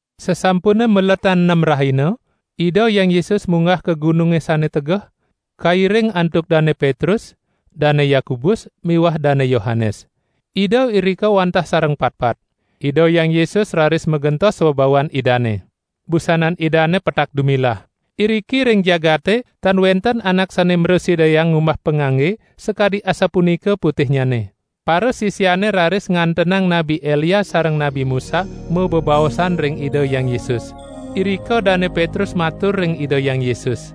Sasampune maletan nem rahina, Ida Hyang Yesus munggah ka gununge sane tegeh, kairing antuk Dane Petrus, Dane Yakobus miwah Dane Yohanes. Ida irika wantah sareng patpat. Ida Hyang Yesus raris magentos swabawan Idane. Busanan Idane petak dumilah. Iriki ring jagate tan wenten anak sane mrasidayang ngumbah pangangge sakadi asapunika putihnyane. Parasisiane raris ngantenang Nabi Elia sareng Nabi Musa mabebaosan ring Ida Hyang Yesus. Irika Dane Petrus matur ring Ida Hyang Yesus: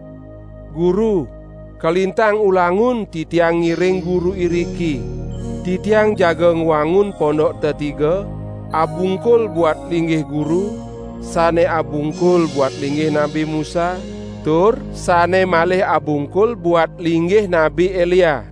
"Guru, kalintang ulangun titiang ngiring Guru iriki. Titiang jaga ngwangun pondok tetiga, abungkul buat linggih Guru, sane abungkul buat linggih Nabi Musa, tur sane malih abungkul buat linggih Nabi Elia."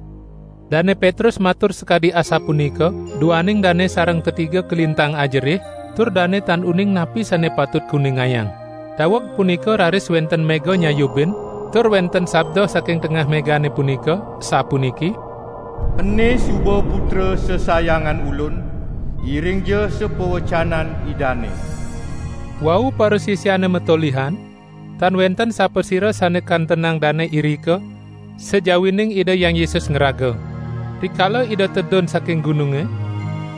Dane Petrus matur sakadi asapunika duaning dane sareng tetiga kalintang ajerih, tur dane tan uning napi sane patut kuningayang. Daweg punika raris wenten mega nyayubin, tur wenten sabda saking tengah megane punika, sapuniki: "Ene suba Putra sesayangan Ulun, iringja sapawecanan Idane." Wau parasisiane matolihan, tan wenten sapasira sane kantenang dane irika, sajawining Ida Hyang Yesus ngraga. Rikala Ida tedun saking gununge,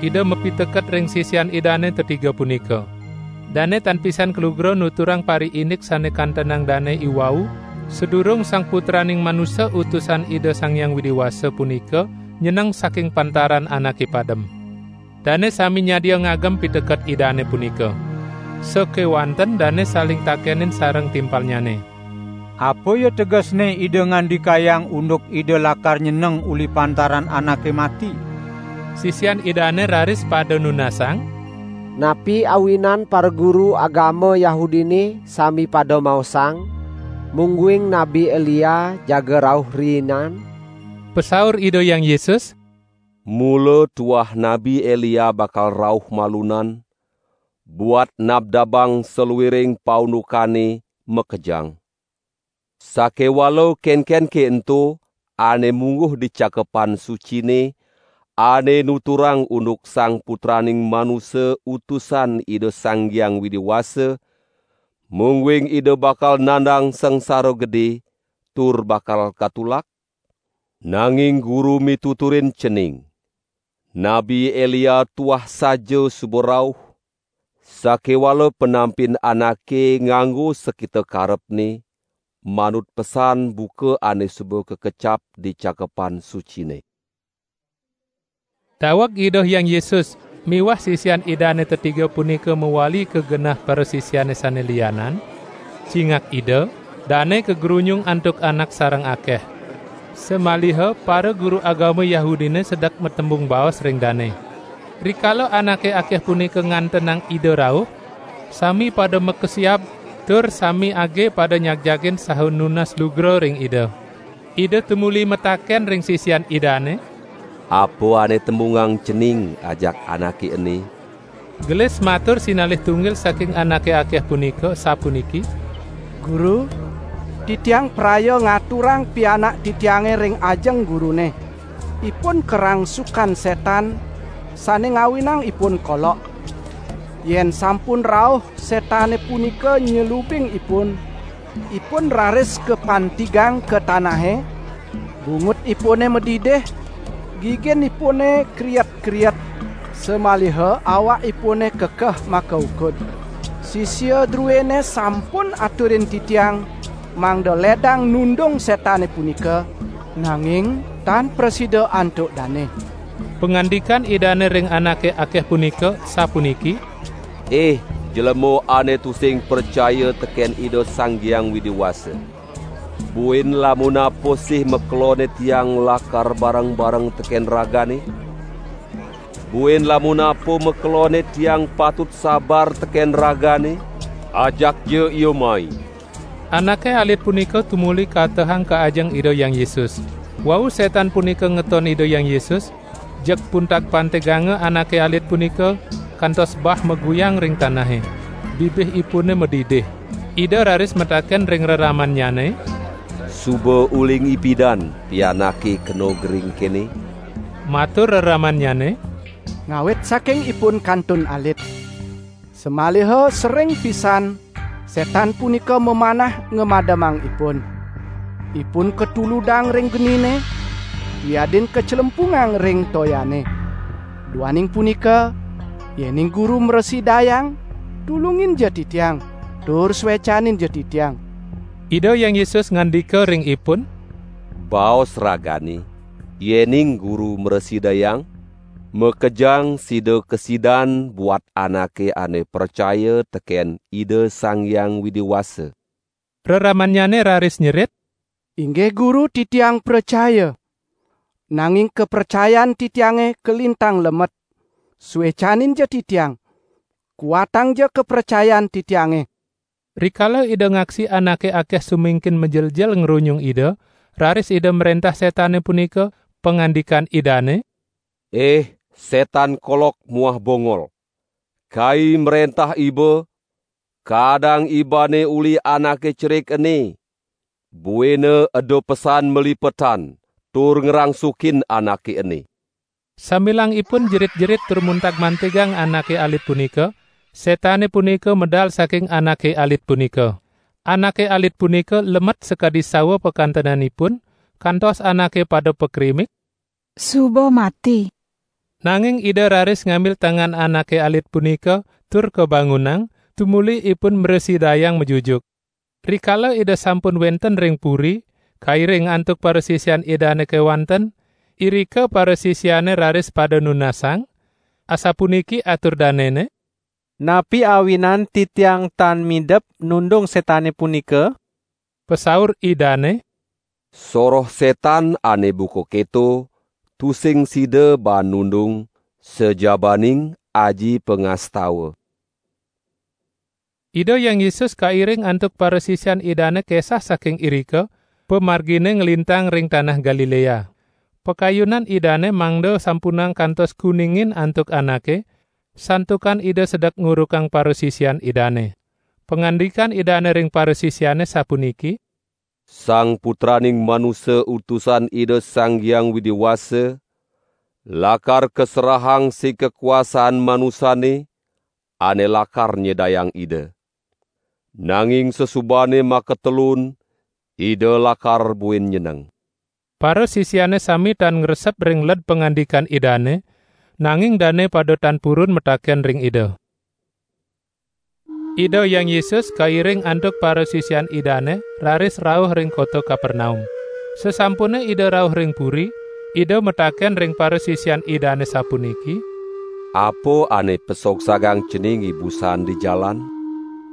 Ida mapiteket ring sisian Idane tetiga punika. Dane tan pisan kalugra nuturang pariindik sane kantenang dane iwau sadurung Sang Putraning Manusa Utusan Ida Sang Hyang Widi Wasa punika nyeneng saking pantaran anake padem. Dane sami nyadia ngagem piteket Idane punika. Sakewanten dane saling takenin sareng timpalnyane: "Apa ya tegesne Ida ngandikayang unduk Ida lakar nyeneng uli pantaran anake mati." Sisian Idane raris pada nunasang: "Napi awinan paraguru agama Yahudine sami pada maosang, mungguing Nabi Elia jaga rauh riinan?" Pasaur Ida Hyang Yesus: "Mula tuah Nabi Elia bakal rauh malunan buat nabdabang saluiring paundukane makejang. Sakewala kenkenke ento ane mungguh di Cakepan Sucine ane nuturang unduk Sang Putraning Manusa Utusan Ida Sang Hyang Widi Wasa, mungguing Ida bakal nandang sangsara gede, tur bakal katulak? Nanging Guru mituturin cening: Nabi Elia tuah saja suba rauh, sakewala panampin anake nganggo sakita karepne, manut pesan buka ane suba kakecap di Cakepan Sucine." Daweg Ida Hyang Yesus miwah sisian Idane tetiga punika mawali ka genah parasisiane sane lianan, cingak Ida dane kagrunyung antuk anak sareng akeh. Samaliha paraguru agama Yahudine sedek matembung baos ring dane. Rikala anake akeh punika ngantenang Ida rauh, sami pada makesiab tur sami age pada nyagjagin saha nunas lugra ring Ida. Ida tumuli mataken ring sisian Idane: "Apa ane tembungang cening ajak anake ene?" Gelis matur sinalih tunggil saking anake akeh punika, sapuniki: "Guru, titiang praya ngaturang pianak titiange ring ajeng Gurune. Ipun karangsukan setan sane ngawinang ipun kolok. Yen sampun rauh setane punika nyelubin ipun, ipun raris kapantigang ka tanahe, bungutipune madidih, giginipune kriet-kriet samaliha awakipune kekeh makaukud. Sisia druene sampun aturin titiang mangda ledang nundung setane punika, nanging tan prasida antuk dane." Pangandikan Idane ring anake akeh punika, sapuniki: "Ih jlema ane tusing pracaya teken Ida Sang Hyang Widi Wasa. Buin lamun apa sih makelonne Tiang lakar bareng-bareng teken ragane? Buin lamun apa makelonne Tiang patut sabar teken ragane? Ajakja ia mai!" Anake alit punika tumuli katehang ka ajeng Ida Hyang Yesus. Wau setan punika ngeton Ida Hyang Yesus, jeg puntag-pantiganga anake alit punika, kantos bah maguyang ring tanahe. Bibihipune madidih. Ida raris mataken ring reramannyane: "Suba uling ipidan pianake kena gering kene?" Matur reramannyane: "Ngawit saking ipun kantun alit. Samaliha sering pisan setan punika mamanah ngamademang ipun. Ipun katuludang ring genine, wiadin kaclempungang ring toyane. Duaning punika, yening Guru mrasidayang, tulunginja titiang, tur suecaninja titiang!" Ida Hyang Yesus ngandika ring ipun: "Baos ragane, yening Guru mrasidayang? Makejang sida kasidan buat anake ane pracaya teken Ida Sang Hyang Widi Wasa." Reramannyane raris nyerit: "Inggih Guru titiang pracaya! Nanging kapracayan titiange kalintang lemet, suecaninja titiang, kuatangja kapracayan titiange!" Rikala Ida ngaksi anake akeh sumingkin majeljel ngrunyung Ida, raris Ida mrentah setane punika, pangandikan Idane: "Ih setan kolok muah bongol, Kai mrentah iba, kaadang ibane uli anake cerik ene, buina eda pesan malipetan tur ngrangsukin anake ene." Sambilang ipun jerit-jerit tur muntag-mantigang anake alit punika, setane punika medal saking anake alit punika. Anake alit punika lemet sakadi sawa pakantenanipun, kantos anake pada pakrimik: "Suba mati!" Nanging Ida raris ngambil tangan anake alit punika tur kabangunang, tumuli ipun mrasidayang majujuk. Rikala Ida sampun wenten ring puri, kairing antuk parasisian Idane kewanten, irika parasisiane raris pada nunasang, asapuniki atur danene: "Napi awinan titiang tan midep nundung setane punika?" Pasaur Idane: "Soroh setan ane buka keto tusing sida baan nundung sajabaning aji pangastawa." Ida Hyang Yesus kairing antuk parasisian Idane kesah saking irika, pamargine nglintang ring tanah Galilea. Pakayunan Idane mangda sampunang kantos kuningin antuk anake, santukan Ida sedek ngurukang parasisian Idane. Pangandikan Idane ring parasisiane sapuniki: "Sang Putraning Manusa Utusan Ida Sang Hyang Widi Wasa, lakar kaserahang sig kakuasaan manusane, ane lakar nyedayang Ida. Nanging sasubane makatelun Ida lakar buin nyeneng." Parasisiane sami tan ngresep ring led pangandikan Idane, nanging dane pada tan purun mataken ring Ida. Ida Hyang Yesus kairing antuk parasisian Idane raris rauh ring kota Kapernaum. Sasampune Ida rauh ring puri, Ida mataken ring parasisian Idane sapuniki: "Apa ane pasogsagang cening ibusan di jalan?"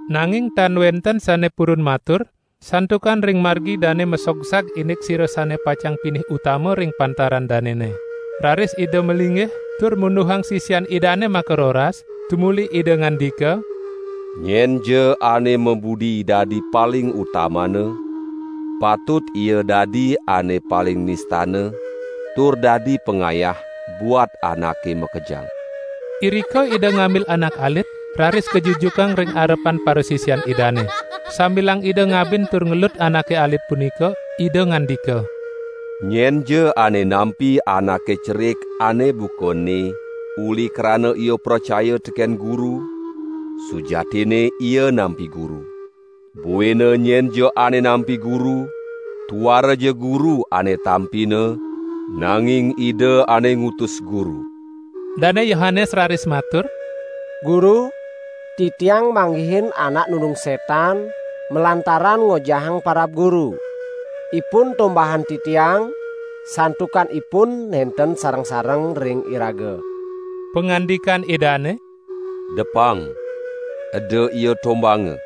Nanging tan wenten sane purun matur, santukan ring margi dane masogsag indik sira sane pacang pinih utama ring pantaran danene! Raris Ida malinggih, tur munduhang sisian Idane makaroras, tumuli Ida ngandika: "Nyenja ane mabudi dadi paling utamana, patut ia dadi ane paling nistana tur dadi pangayah buat anake makejang." Irika Ida ngambil anak alit, raris kajujukang ring arepan parasisian Idane. Sambilang Ida ngabin tur ngelut anake alit punika Ida ngandika: "Nyenja ane nampi anake cerik ane buka ene uli krana ia pracaya teken Guru, sujatinne ia nampi Guru. Buina nyenja ane nampi Guru, tuaraja Guru ane tampina nanging Ida ane ngutus Guru." Dane Yohanes raris matur: "Guru, titiang manggihin anak nundung setan malantaran ngojahang parab Guru. Ipun tombahang titiang, santukan ipun nenten sareng-sareng ring iraga!" Pangandikan Idane: "Depang, eda ia tombahanga!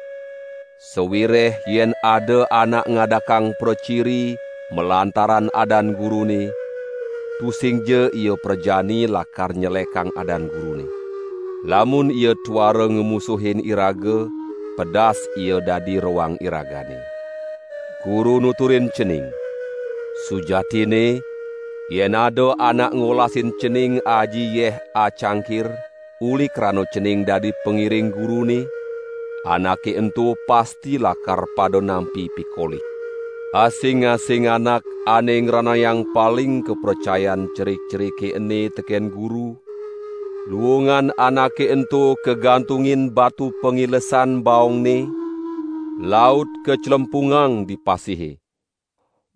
Sawireh yen ada anak ngadakang praciri malantaran adan Gurune, tusingja ia prajani lakar nyelekang adan Gurune. Lamun ia tuara ngamusuhin iraga, pedas ia dadi roang iragane. Guru nuturin cening: Sujatinne yen ada anak ngolasin cening aji yeh acangkir, uli krana cening dadi pangiring Gurune, anake ento pasti lakar pada nampi pikolih." "Asing-asing anak ane ngranayang paling kapracayan cerik-cerike ene teken Guru, luungan anake ento kagantungin batu pangilesan baongne laut kaclempungang di pasihe.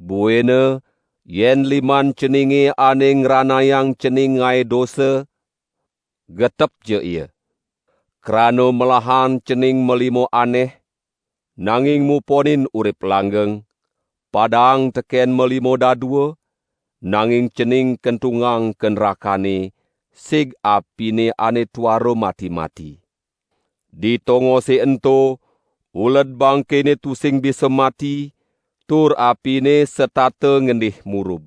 Buina yen liman ceninge ane ngranayang cening ngae dosa, getepja ia! Krana melahan cening malima aneh, nanging muponin urip langgeng, padaang teken malima dadua, nanging cening kentungang ka nrakane, sig apine ane tuara mati-mati. [ Di tongose ento uled bangkene tusing bisa mati tur apine setata ngendih murub.]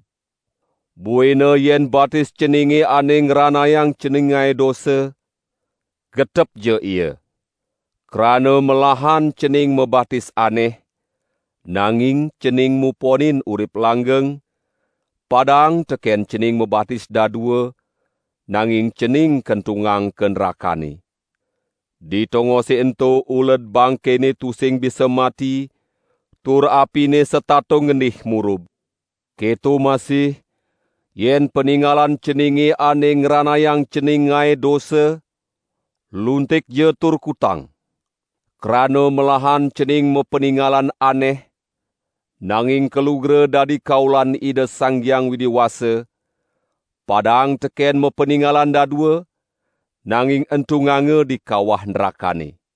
Buina yen batis ceninge ane ngranayang cening ngae dosa, getepja ia! Krana melahan cening mabatis aneh, nanging cening muponin urip langgeng, padaang teken cening mabatis dadua, nanging cening kentungang ka nrakane. [ Di tongose ento uled bangkene tusing bisa mati tur apine setata ngendih murub.] Keto masih yen paningalan ceninge ane ngranayang cening ngae dosa, luntikja tur kutang! Krana melahan cening mapaningalan aneh, nanging kalugra dadi kaulan Ida Sang Hyang Widi Wasa padaang teken mapaningalan dadua nanging entunganga di kawah nrakane.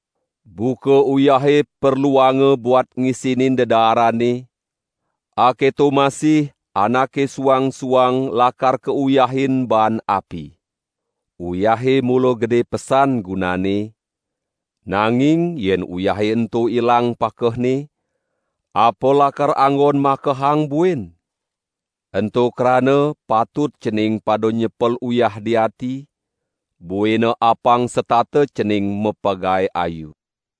Buka uyahe perluanga buat ngisinin dedaarane, aketo masih anake suang-suang lakar kauyahin baan api. Uyahe mula gede pesan gunanne nanging yen uyahe ento ilang pakehne, apa lakar anggon makehang buin? Ento krana patut cening pada nyepel uyah di ati, buina apang setata cening mapagae ayu."